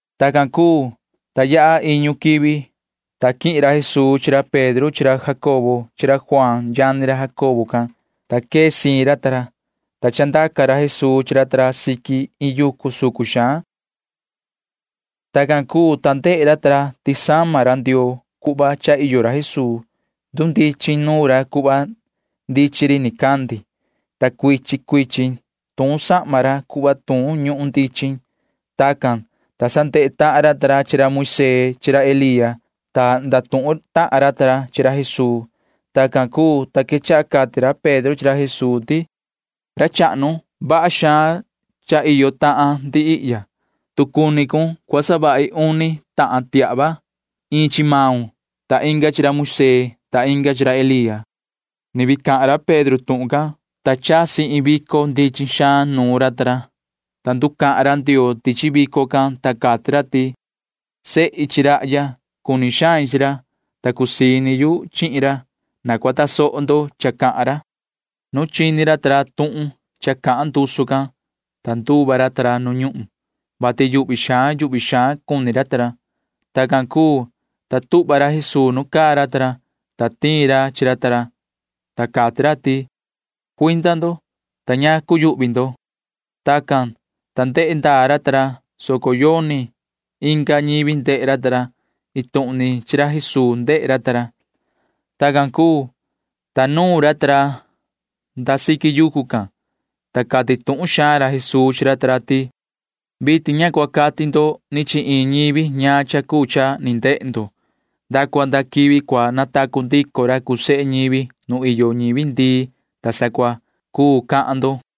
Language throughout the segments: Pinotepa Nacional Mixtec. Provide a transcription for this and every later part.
Tacan cuu, ta yaha iñu quivi, ta quihin ra Jesuu chi ra Pedro chi ra Jacobo chi ra Juaan yani ra Jacobo can. Quee siin ra ta ra, ta chandaca ra Jesuu chi ra ta ra siqui iin yucu sucun sucun. Tacan cuu, ta ndehe ra ta ra ti sama ra Ndioo cuhva cha iyo ra Jesuu. Ndundichin nuun ra cuhva ndichin ndehe ri nicandi, ta cuichin cuichin tuun sahma ra cuhva tuun ñuhun ndichin. Tacan, ta sa ndehe tahan ra ta ra chi ra Moisee chi ra Elía, ta ndatuhun tahan ra ta ra chi ra Jesuu. Tacan cuu, ta quechaha cati ra Pedro chi ra Jesuu ti: ―Ra chahnu, vaha xaan cha iyo tahan ndi ihya. Tu cua cuni cun, cua savahi uni tiahva ihya―iin chi maun, ta inga chi ra Moisee, ta inga chi ra Elía. Ni vii cahan ra Pedro tuhun can, ta jihna cha chasi iin vico ndichin xaan nuun ra ta ra, ta nducahan ra Ndioo tichi vico can, ta cati ra ti: ―Sehi chi rahya. Cuni xain chi ra, ta cusii ini yu chihin ra. Na cua tasoho ndo cha cahan ra. Nu chini ra ta ra tuhun cha cahan ndusu can, ta nduva ra ta ra nu ñuhun, vati yuhvi xaan yuhvi xaan cuni ra ta ra. Tacan cuu, ta tuhva ra Jesuu nuun caa ra ta ra, ta taa ra ndaha ra chi ra ta ra, ta cati ra ti: ―Cuinda ndo, ta ña cuyuhvi ndo ―cati ra. Tacan, ta ndehe ndaa ra ta ra, soco yoni ca ñivi ndehe ra ta ra. Iin tuhun ni ra Jesuu ndehe ra ta ra. Tacan cuu, ta nuun ra ta ra nda siqui yucu can, ta cati tuhun xaan ra Jesuu chi ra ta ra ti: ―Vitin ña cua cahan ndo ni chi iin ñivi ñaan cha cuu cha ni ndehe ndo. Nda cua nda quivi cua natacu ndico ra cuu sehe ñivi nu iyo ñivi ndii, ta sa cua cuu cahan ndo ―cati ra.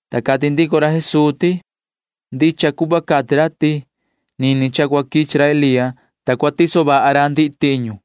Ta cati ndico ra Jesuu ti: ―[Ndicha cuhva cati ra ti] nini cha cua quichi ra Elía, ta cua tiso vaha ra ndihi tiñu,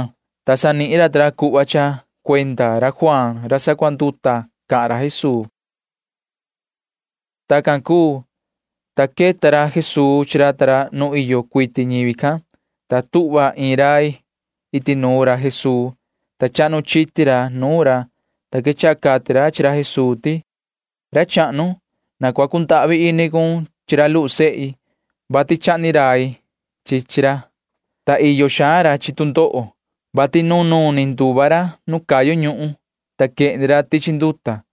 Tacan, ta sa nihin racan ta ra cuhva ti cuenda ra Juaan ra sacuanduta cahan ra Jesuu tuhun can. Tacan cuu, ta queta ra Jesuu chi ra ta ra nu iyo cuiti ñivi can, ta tuhva iin rai iti nuun ra Jesuu, ta chahnu chiti ra nuun ra, ta quechaha cati ra chi ra Jesuu ti: ―Ra chahnu, na cua cundahvi ini cun chi ra luhu sehi, vati chahni rai chi chi ra, ta iyo xaan ra chi tu ndoho, vati nunuun ni nduva ra nu cayu ñuhun, ta quehni ra tichi nduta.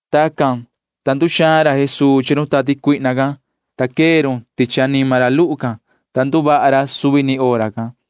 Tacan, ta nduxaan ra Jesuu chi run tati cuihna can, ta quee run tichi anima ra luhu can, ta nduvaha ra suvi ni hora can.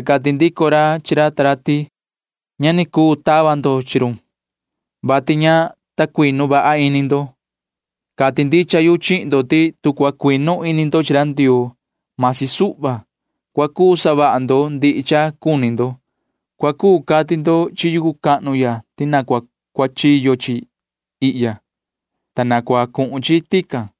Ta cati ndico ra chi ra ta ra ti: ―Ña ni cuu tava ndaa ndo chi run, vati ña ta cuinu vaha ini ndo. Cati ndicha yu chihin ndo ti tu cua cuinu ini ndo chi ra Ndioo―masi suhva, cua cuu savaha ndo ndihi cha cuni ndo. Cua cuu cati ndo chi yucu cahnu ya ti cua cuachiyo chi tihya, ta cua cuhun chi tican.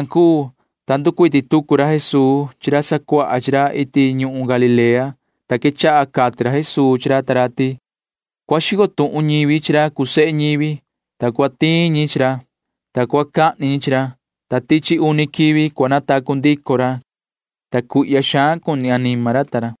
Tacan cuu, ta nducuiti tucu ra Jesuu chi ra sacuaha chi ra iti ñuhun Galilea, ta quechaha cati ra Jesuu chi ra ta ra ti: ―Cua xico tuhun ñivi chi ra cuu sehe ñivi, ta cua tiin ñi chi ra, ta cua cahni ñi chi ra, ta tichi uni quivi cua natacu ndico ra ―cati ra, ta cuihya xaan cuni anima ra ta ra.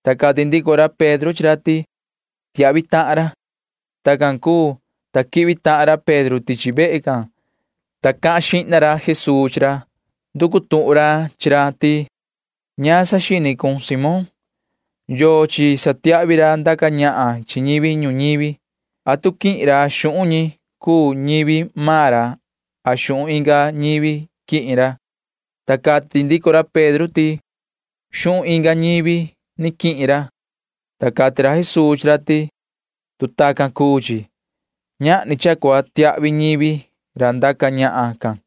Ta cati ndico ra Pedro chi ra ti: ―Tiahvi tahan ra ―cati ra. Tacan cuu, ta quihvi tahan ra Pedro tichi vehe can, ta cahan xihna ra Jesuu chi ra. Nducu tuhun ra chi ra ti: ―¿Yoso saxini maun, yoho Simón? ¿Yochi satiahvi ra ndaca ñahan chi ñivi ñuñivi? ¿Atu quihin ra xuhun ñi cuu ñivi maan ra a xuhun inga ñivi quihin ra? ―cati ra Jesuu. Ta cati ndico ra Pedro ti: ―Xuhun inga ñivi ni quihin ra. Ta cati ra Jesuu chi ra ti: ―Tu chacan cuu chi, ñahni cha cua tiahvi ñivi ra ndaca ñahan can.